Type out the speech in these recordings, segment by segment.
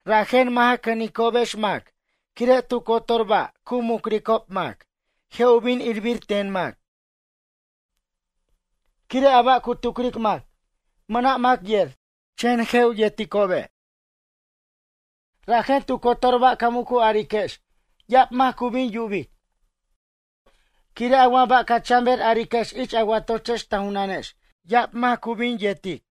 Rajen, mʌ' ja cʌnicobex quire' tu cotor ba' cu mucricob mac je' u bin irbir ten mac. Quire' a ba' cu tucric mac, mʌna' mac yer, chen je' u yerticobe'. Rajen tu cotor ba' ca mucu'ariquex ya'ab mac cu bin yubic. Quire' a wa ba' ca chan ber ariquex ich a watochex ta junanex ya'ab mac cu bin yertic.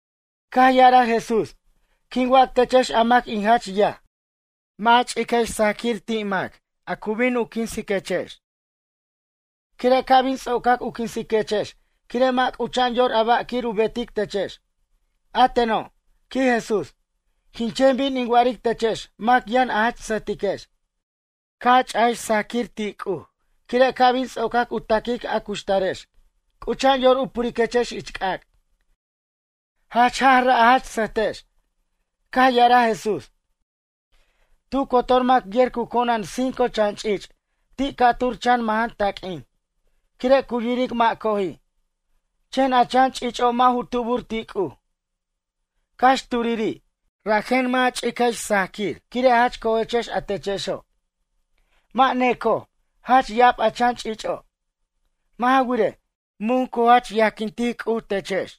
Caj ya'araj Jesús: ―Quin wac techex a mac in jach yaj, mʌ' a ch'iquex sajaquir ti' a mac a cu bin u quinsiquechex. Quire' ca' bin ts'ocac u quinsiquechex quire' mʌ' c'ucha'an yor ba' quir u betic techex. A teno' ―quij Jesús―, quin chen bin in wa'aric techex mac yʌn a jach sʌjtiquex. Ca' a ch'iquex sajaquir ti' C'uj quire' ca' bin ts'ocac u taquic a cuxtarex c'ucha'an yor u puriquechex ich c'ac'. Jach jaj ra' a jach sʌjtex. Caj ya'araj Jesús: ―Tu cotor mac yer cu conan cinco chan ch'ich' ti' ca'tur chan majan taq'uin. Quire' cu yiric mʌ' coji'. Chen a chan ch'ich'o' mʌ' u tubur ti' C'uj, cax turiri'. Rajen mʌ' a ch'iquex sajaquir quire' jach cojechex a techexo'. Mʌ' necoj, jach ya'ab a chan ch'ich'o'. Mʌ' ja wirej, mun C'uj cu jach yajquintic techex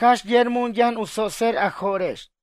cax yer mun yʌn u tsotser a jo'rex.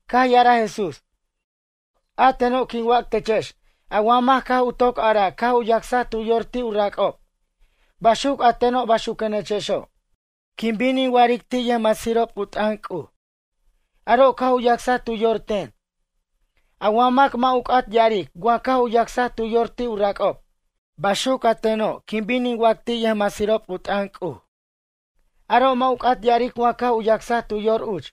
Caj ya'araj Jesús: ―A teno' quin wac techex a wa mac caj u toc araj caj u yacsaj tu yor ti' u rac'ob. Baxuc a teno' baxuquenechexo'. Quin bin in wa'aric ti' yʌjmasirob u t'ʌn C'uj: Aro' caj u yacsaj tu yor ten. A wa mac mʌ' u c'at ya'aric wa caj u yacsaj tu yor ti' u rac'ob, baxuc a teno' quin bin in wac ti' yʌjmasirob u t'ʌn C'uj: Aro' mʌ' u c'at ya'aric wa caj u yacsaj tu yor uch.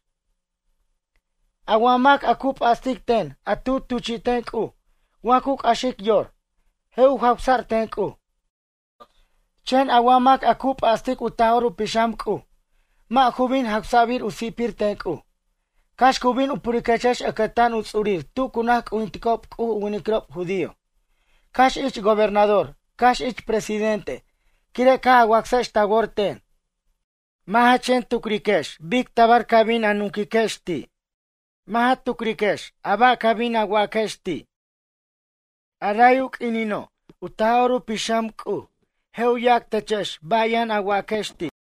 ’A wa mac a cu p'astic ten a tu tuchi'ten C'uj wa cu c'axic yor, je' u jawsa'r ten C'uj. Chen a wa mac a cu p'astic u Taj'or u Pixam C'uj, mʌ' ju bin jawsa'bir u si'pir ten C'uj. ’Cax cu bin u puriquechex ʌcʌtan u ts'urir tu cu naj c'ujinticob C'uj u winiquirob judío. Cax ich gobernador cax ich presidente quire' caj a wacsex ta wor ten. Mʌ' ja chen tucriquex bic tabar ca bin a nunquiquex ti'. Mʌ' ja tucriquex a ba' ca bin waquex ti'. A ray u q'uinino' u Taj'or u Pixam C'uj, je' u yac techex ba' yʌn a waquex ti'.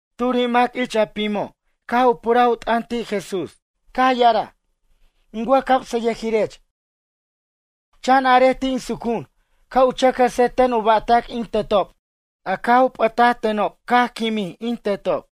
Turi' mac ich a pimo' caj u puraj u t'ʌn ti' Jesús, caj ya'araj: ―In wʌjcamsʌyʌjirech, chan arej ti' in sucu'un ca' u chʌc jʌse ten u ba'tac in tetob a caj u p'ʌtʌtenob caj quimin in tetob.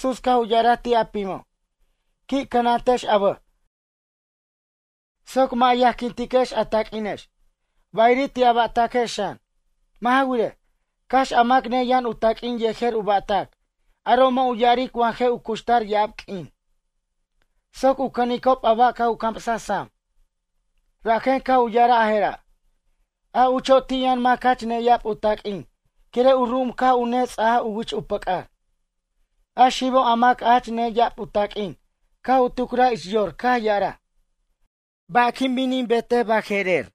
Rajen Jesús caj u ya'araj ti' a pimo': ―Qui' cʌnantex a bʌj soc mʌ' a yajquintiquex a taq'uinex, bayiri' ti' a ba'taquex xan. Mʌ' ja wirej, cax a mac neyʌn u taq'uin yejer u ba'tac, aro' mʌ' u ya'aric wa je' u cuxtar ya'ab q'uin. Soc u cʌnicob a ba' caj u camsaj sam, rajen caj u ya'araj a je'ra': ―A ucho' ti' yʌn mac jach neya'ab u taq'uin quire' u ru'um caj u nets'ajaj u wich u pʌc'ar. A xibo' a mac jach neya'ab u taq'uin caj u tucraj ich yor caj ya'araj: “Ba' quin bin in betej baje'rer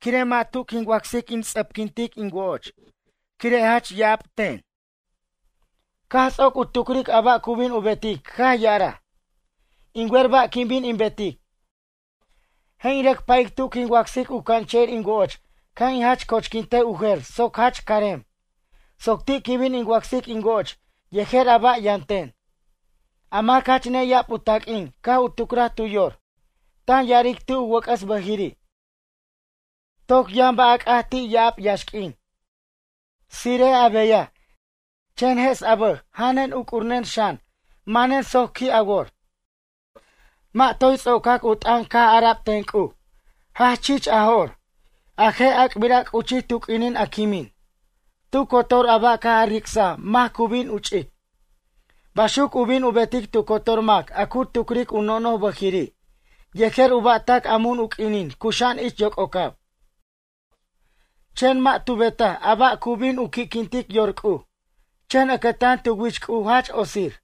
quire' mʌ' tu quin wacsic in ts'ʌpquin tin wo'och quire' jach ya'ab ten?” Caj ts'oc u tucric a ba' cu bin u betic caj ya'araj: “In wer ba' quin bin in betic. Je' in rʌc pa'ic tu quin wacsic u canche'ir in woch ca' in jach cochquintej u jer soc jach carem. Soc ti' quin bin in wacsic in woch yejer a ba' yʌn ten.” A mac jach neya'ab u taq'uin caj u tucraj tu yor, tan ya'aric ti' u wʌc'ʌs bʌjiri': “Toc yʌn ba' a c'at ti' ya'ab yaxq'uin. Tsire'ej a beyaj chen jes a bʌj janen uc'urnen xan manen soc qui' a wor.” Mʌ' toy ts'ocac u t'ʌn caj ara'b ten C'uj: “Jach chich a jo'r, a je' ac'bira' c'uchij tu q'uinin a quimin. Tu cotor a ba' a caj a ric'saj mac cu bin u ch'ic?” Baxuc u bin u betic tu cotor mac a cu tucric u nono'j bʌjiri' yejer u ba'tac a mun u q'uinin cuxa'an ich yoc'ocab. Chen mʌ' tu betaj a ba' cu bin u qui'quintic yor C'uj. Chen ʌcʌtan tu wich C'uj jach otsir.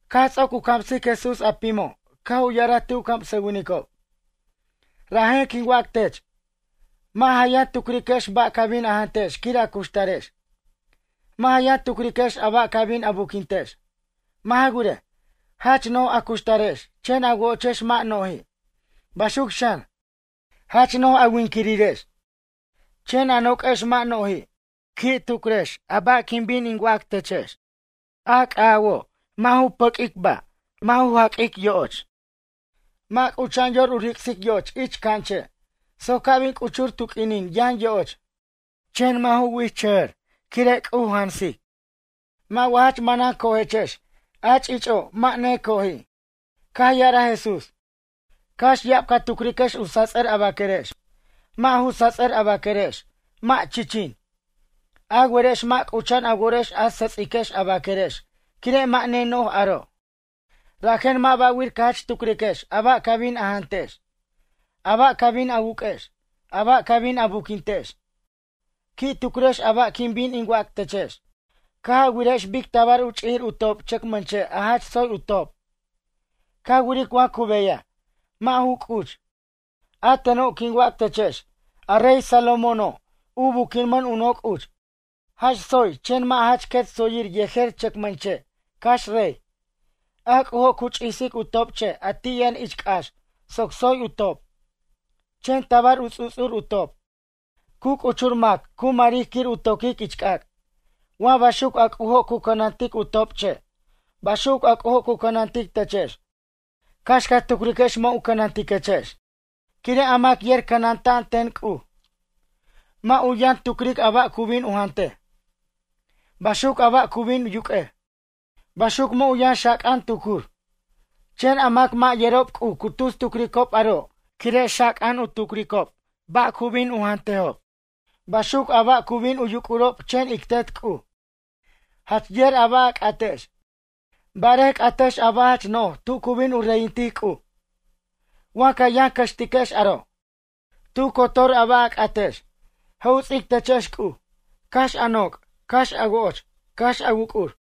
Caj ts'oc u camsic Jesús a pimo' caj u ya'araj ti' u camsʌwinicob: ―Rajen quin wac tech: Mʌ' ja yʌn tucriquex ba' ca bin a jantex quir a cuxtarex. Mʌ' ja yʌn tucriquex a ba' ca bin a buquintex. Mʌ' ja wirej, jach no'j a cuxtarex chen a wochex mʌ' no'ji'. Baxuc xan, jach no'j a winquirirex chen a noq'uex mʌ' no'ji'. Qui' tucrex a ba' quin bin in wac techex. A c'awojo', mʌ' ju pʌq'uic ba' mʌ' ju jaq'uic yo'och, mʌ' c'ucha'an yor u ric'sic yoch ich c'anche' soc ca' bin c'uchur tu q'uinin yʌn yoch. Chen mʌ' ju wichʌjʌr quire' C'uj cu jansic. Mʌ' wa jach manan cojechex a ch'ich'o', mʌ' necoji'. Caj ya'araj Jesús: ―Cax ya'ab ca tucriquex u sats'ʌr a baquerex, mʌ' ju sats'ʌr a baquerex, mʌ' chichin. A werechex mʌ' c'ucha'an a worex a sʌts'iquex a baquerex quire' mʌ' neno'j aro'. Rajen mʌ' ba'wir ca jach tucriquex a ba' ca bin a jantex, a ba' ca bin a wuq'uex, a ba' ca bin a buquintiquex. ’Qui' tucriquex a ba' quin bin in wac techex. Caj a wirajex bic tabar u ch'ijir u top' chʌcmʌnche' a jach tsoy u top'. Ca wiric wa cu beyaj, mʌ' ju c'uch. A teno' quin wac techex. A rey Salomóno', u buquimʌn u noc' uch, jach tsoy chen mʌ' jach quet tsoyir yejer chʌcmʌn che', cax rey. A C'ujo' cu ch'isic u top'che' a ti' yʌn ich c'ax soc tsoy u top', chen tabar u ts'u'ts'ur u top'. Cu c'uchur mac cu maric quir u toquic ich c'ac'. Wa baxuc a C'ujo' cu cʌnantic u top'che'. Baxuc a C'ujo' cu cʌnantic techex, cax ca tucriquex mʌ' u cʌnantiquechex. Quire' a mac yer cʌnanta'an ten C'uj, mʌ' u yʌn tucric a ba' cu bin u jantej. Baxuc a ba' cu bin yuq'uej. Baxuc mʌ' u yʌn xaca'an tucur. Chen a mac a mʌ' yerob C'uj cu tus tucricob aro' quire' xaca'an u tucricob ba' cu bin u jantejob. Baxuc a ba' cu bin u yuc'urob chen ic Tet C'uj, jach yer a ba' a c'atex. Barej c'ajtex a ba' jach no'j tu cu bin u reyintic C'uj. Wa ca yʌn cʌxtiquex aro', tu cotor a ba' a c'atex, je' u ts'ic techex C'uj. Cax a noc', cax a woch, cax a wuc'ur.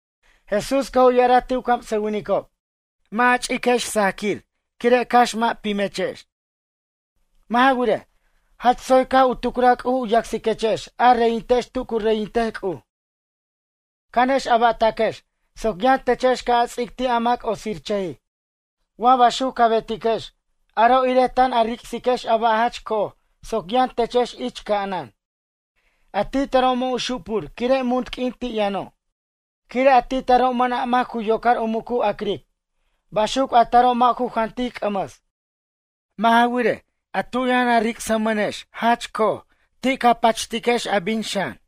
Jesús caj u ya'araj ti' u camsʌwinicob: ―Mʌ' ja ch'iquex sajaquir quire' cax mʌ' pimechex. Mʌ' ja wirej, jach tsoy caj u tucraj C'uj u yacsiquechex a reyintex tu cu reyintej C'uj. Cʌnex a ba'taquex soc yʌn techex ca' a ts'ic ti' a mac otsirchʌjij. Wa baxuc ca betiquex, aro' irej tan a ric'siquex a ba' jach co'oj soc yʌn techex ich ca'anan. A ti taro' mʌ' u xupur quire' munt q'uin ti' yʌno'. Quire' ti taro' mʌna' mac cu yocar u muc u ac'ric. Baxuc a taro' mʌ' ju jantic c'ʌmʌs. Mʌ' ja wirej, a tu yʌn a ric'smʌnex jach co'oj ti' ca pachiquex a bin xan.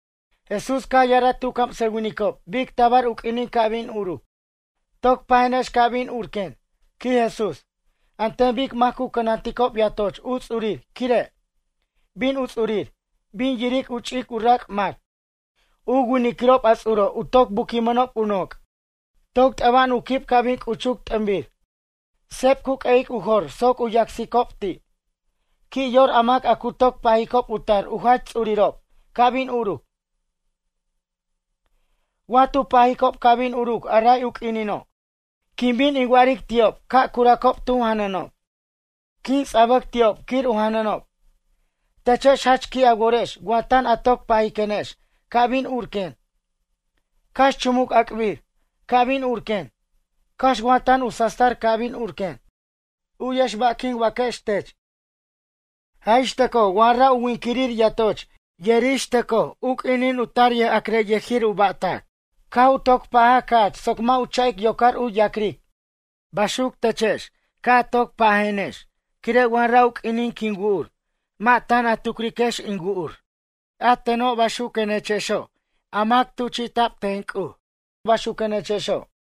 Jesús caj ya'araj ti' u camsʌwinicob bic tabar u q'uinin ca' bin uruc: ―Toc pajenex ca' bin urquen ―quij Jesús―, an ten bic mac cu cʌnanticob yatoch u ts'urir quire'. Bin u ts'urir, bin yiric u ch'ic u rac' mac. U winiquirob a ts'uro' u toc buquimʌnob u noc'. Toc t'ʌba'an u quib ca' bin c'uchuc t'ʌnbir. Seb cu q'ueyic u jor soc u yacsicob ti'. Qui' yor a mac a cu toc pajicob u tar u jach ts'urirob ca' bin uruc. Wa tu pajicob ca' bin uruc a ray u quinino', quin bin in wa'aric ti'ob ca' curacob tu janʌnob. Quin ts'abʌc ti'ob quir u janʌnob. Techex jach qui' a worex wa tan a toc pajiquenex ca' bin urquen. Cax chumuc ac'bir. Ca' bin urquen, cax wa tan u sastar ca' bin urquen. Uyex ba' quin waquex tech. Jaj ixtʌcoj wa ra' u winquirir yatoch yer ixtʌcoj u q'uinin u tar yʌjac'rayʌjir ba'tac caj u toc pajaj ca'ch soc mʌ' u cha'ic yocar u yac'ric. Baxuc techex ca' a toc pajiquex quire' wa ra' u q'uinin quin wu'ur mʌ' tan a tucriquex in wu'ur. A teno' a mac tuchi'ta'b ten C'uj baxuquenechexo'.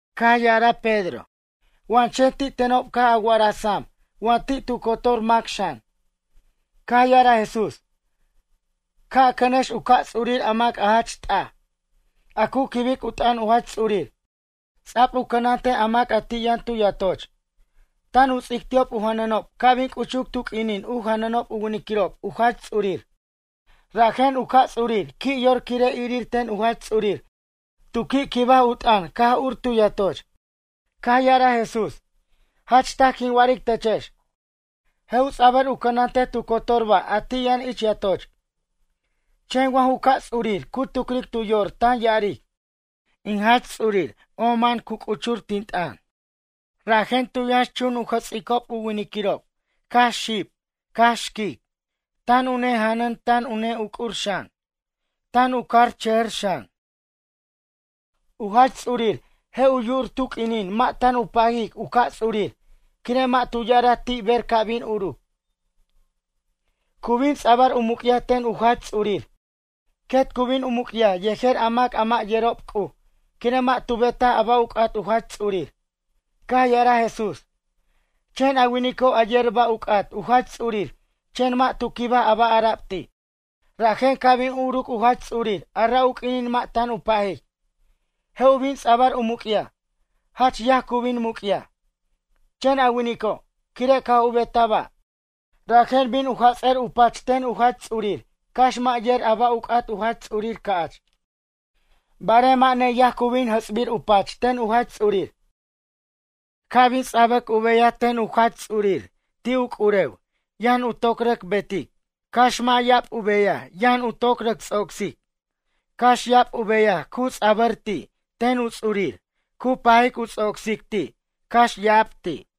Caj ya'araj Pedro: ―Wa chen ti' tenob caj a wa'araj sam wa ti' tu cotor mac xan. Caj ya'araj Jesús: ―Ca' a cʌnex u ca' ts'urir a mac jach t'aj, a cu quib u t'ʌn u Jach Ts'urir ts'a'b u cʌnantej a mac ti' yʌn tu yatoch. Tan u ts'ic ti'ob u janʌnob ca' bin c'uchuc tu q'uinin u janʌnob u winiquirob u Jach Ts'urir. Rajen u ca' ts'urir qui' yor quire' irir ten u Jach Ts'urir tu qui' quibaj u t'ʌn caj ur tu yatoch. Caj ya'araj Jesús: ―Jach taj quin wa'aric techex. Je' u ts'abʌr u cʌnantej tu cotor ba' a ti' yʌn ich yatoch. Chen wa ju ca' ts'urir cu tucric tu yor tan ya'aric: “In jach ts'urir ama'an cu c'uch, tin t'ʌn.” Rajen tu yʌnxchun u jʌts'icob u winiquirob cax xib cax xquic. Tan u nejanʌn tan u ne'uc'ur xan, tan u carchʌj xan. U jach ts'urir je' u yu'ur tu q'uinin mʌ' tan u pajic u ca' ts'urir quire' mʌ' tu ya'araj ti' ber ca' bin uruc. Cu bin ts'abʌr u muc'yaj ten u jach ts'urir. Quet cu bin u muc'yaj yejer a mac a mʌ' yerob C'uj quire' mʌ' tu betaj a ba' u c'at u jach ts'urir. Caj ya'araj Jesús: ―Chen a winico' a yer a ba' u c'at u jach ts'urir chen mʌ' tu quibaj a ba' ara'b ti'. Rajen ca' bin uruc u jach ts'urir ara' u q'uinin mʌ' tan u pajic. Je' u bin ts'abʌr u muc'yaj. Jach yaj cu bin muc'yaj. Chen a winico', quire' caj u betaj ba', rajen bin u jats'ʌr u pach ten u jach ts'urir cax mʌ' yer a ba' u c'at u jach ts'urir ca'ch. Barej mʌ' neyaj cu bin jʌts'bir u pach ten u jach ts'urir. Ca' bin u ts'abʌr u beyaj ten u jach ts'urir ti' u c'urew yʌn u toc rʌc betic. Cax mʌ' ya'ab u beyaj yʌn u rʌc ts'ocsic. Cax ya'ab u beyaj u ts'abʌr ti' ten u ts'urir cu pajic u ts'ocsic ti' cax ya'ab ti'.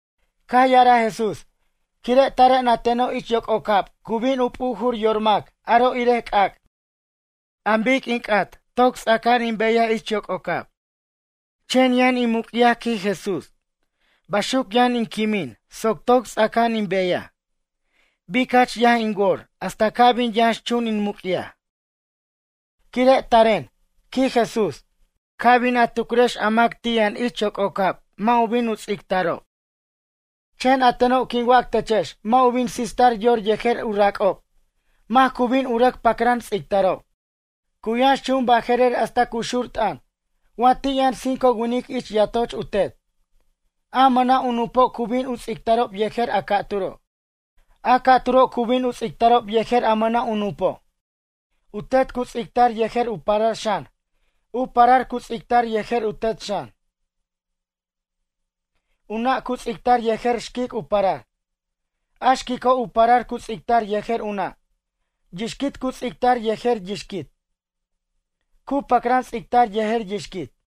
Caj ya'araj Jesús: ―Quire' taren a teno' ich yoc'ocab cu bin u p'ujur yor mac aro' irej c'ac'. An bic in c'at toc ts'aca'an in beyaj ich yoc'ocab. Chen yʌn in muc'yaj ―quij Jesús―, baxuc yʌn in quimin soc toy ts'aca'an in beyaj. Bic jach yaj in wor hasta ca' bin yʌnxchunuc in muc'yaj. Quire' taren ―quij Jesús―, ca bin a tucrex a mac ti' yʌn ich yoc'ocab mʌ' u bin u ts'ictarob. Chen a teno' quin wac techex mʌ' u bin sistar yor yejer u rac'ob mac cu bin u rʌc pacran ts'ictarob. Cu yʌnxchun baje'rer hasta cu xur t'ʌn wa ti' yʌn cinco winic ich yatoch u tet. A mʌna' u nupo' cu bin u ts'ictarob yejer a ca'turo'. A ca'turo' cu bin u ts'ictarob yejer a mʌna' u nupo'. U tet cu ts'ictar yejer u parar xan. U parar cu ts'ictar yejer u tet xan. U nʌ' cu ts'ictar yejer xquic u parar. A xquico' u parar cu ts'ictar yejer u nʌ'. Yixquit cu ts'ictar yejer yixquit. Cu pacran ts'ictar yejer yixquit.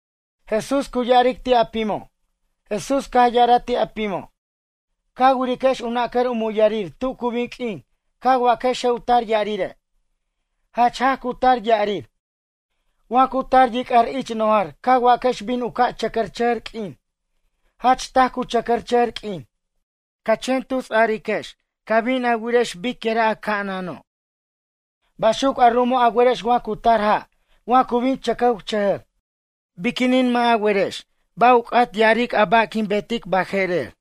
Jesús caj ya'araj ti' a pimo': ―Ca wiriquex u nacar u muyarir tu cu bin q'uin ca waquex je' u tar ya'rire'. Jach jaj cu tar ya'rir. Wa cu tar yic'ar ich nojar ca waquex bin u ca' chʌcʌrchʌjʌr q'uin. Jach taj cu chʌcʌchʌjʌr q'uin. Ca chen tusariquex ca' bin a wirex biquira' a ca'anano'. Baxuc a ru'umo' a werex wa cu tar ja' wa cu bin chʌcʌwchʌjʌr. Biquinin mʌ' a werex ba' u c'at ya'arej a ba' quin betic baje'rer?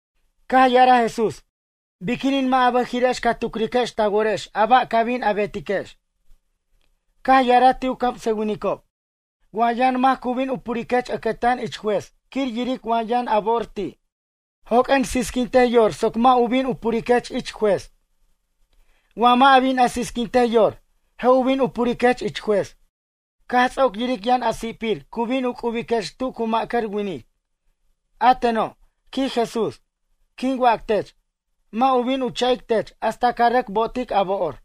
Caj ya'araj Jesús: ―Biquinin mʌ' a bʌjiri'ex ca tucriquex ta worex a ba' ca bin a betiquex? Caj ya'araj ti' u camsʌwinicob: ―Wa yʌn mac cu bin u puriquech ʌcʌtan ich juez quir yiric wa yʌn a bo'or ti'. Joq'uen sisquintej yor soc mʌ' u bin u puriquech ich juez. Wa mʌ' a bin a sisquintej yor, je' u bin u puriquech ich juez. Caj ts'oc yiric yʌn a si'pir cu bin u c'ubiquech tu cu ma'cʌr winic. A teno' ―quij Jesús―, quin wac tech: Mʌ' u bin u cha'ic tech hasta ca rʌc bo'otic a bo'or.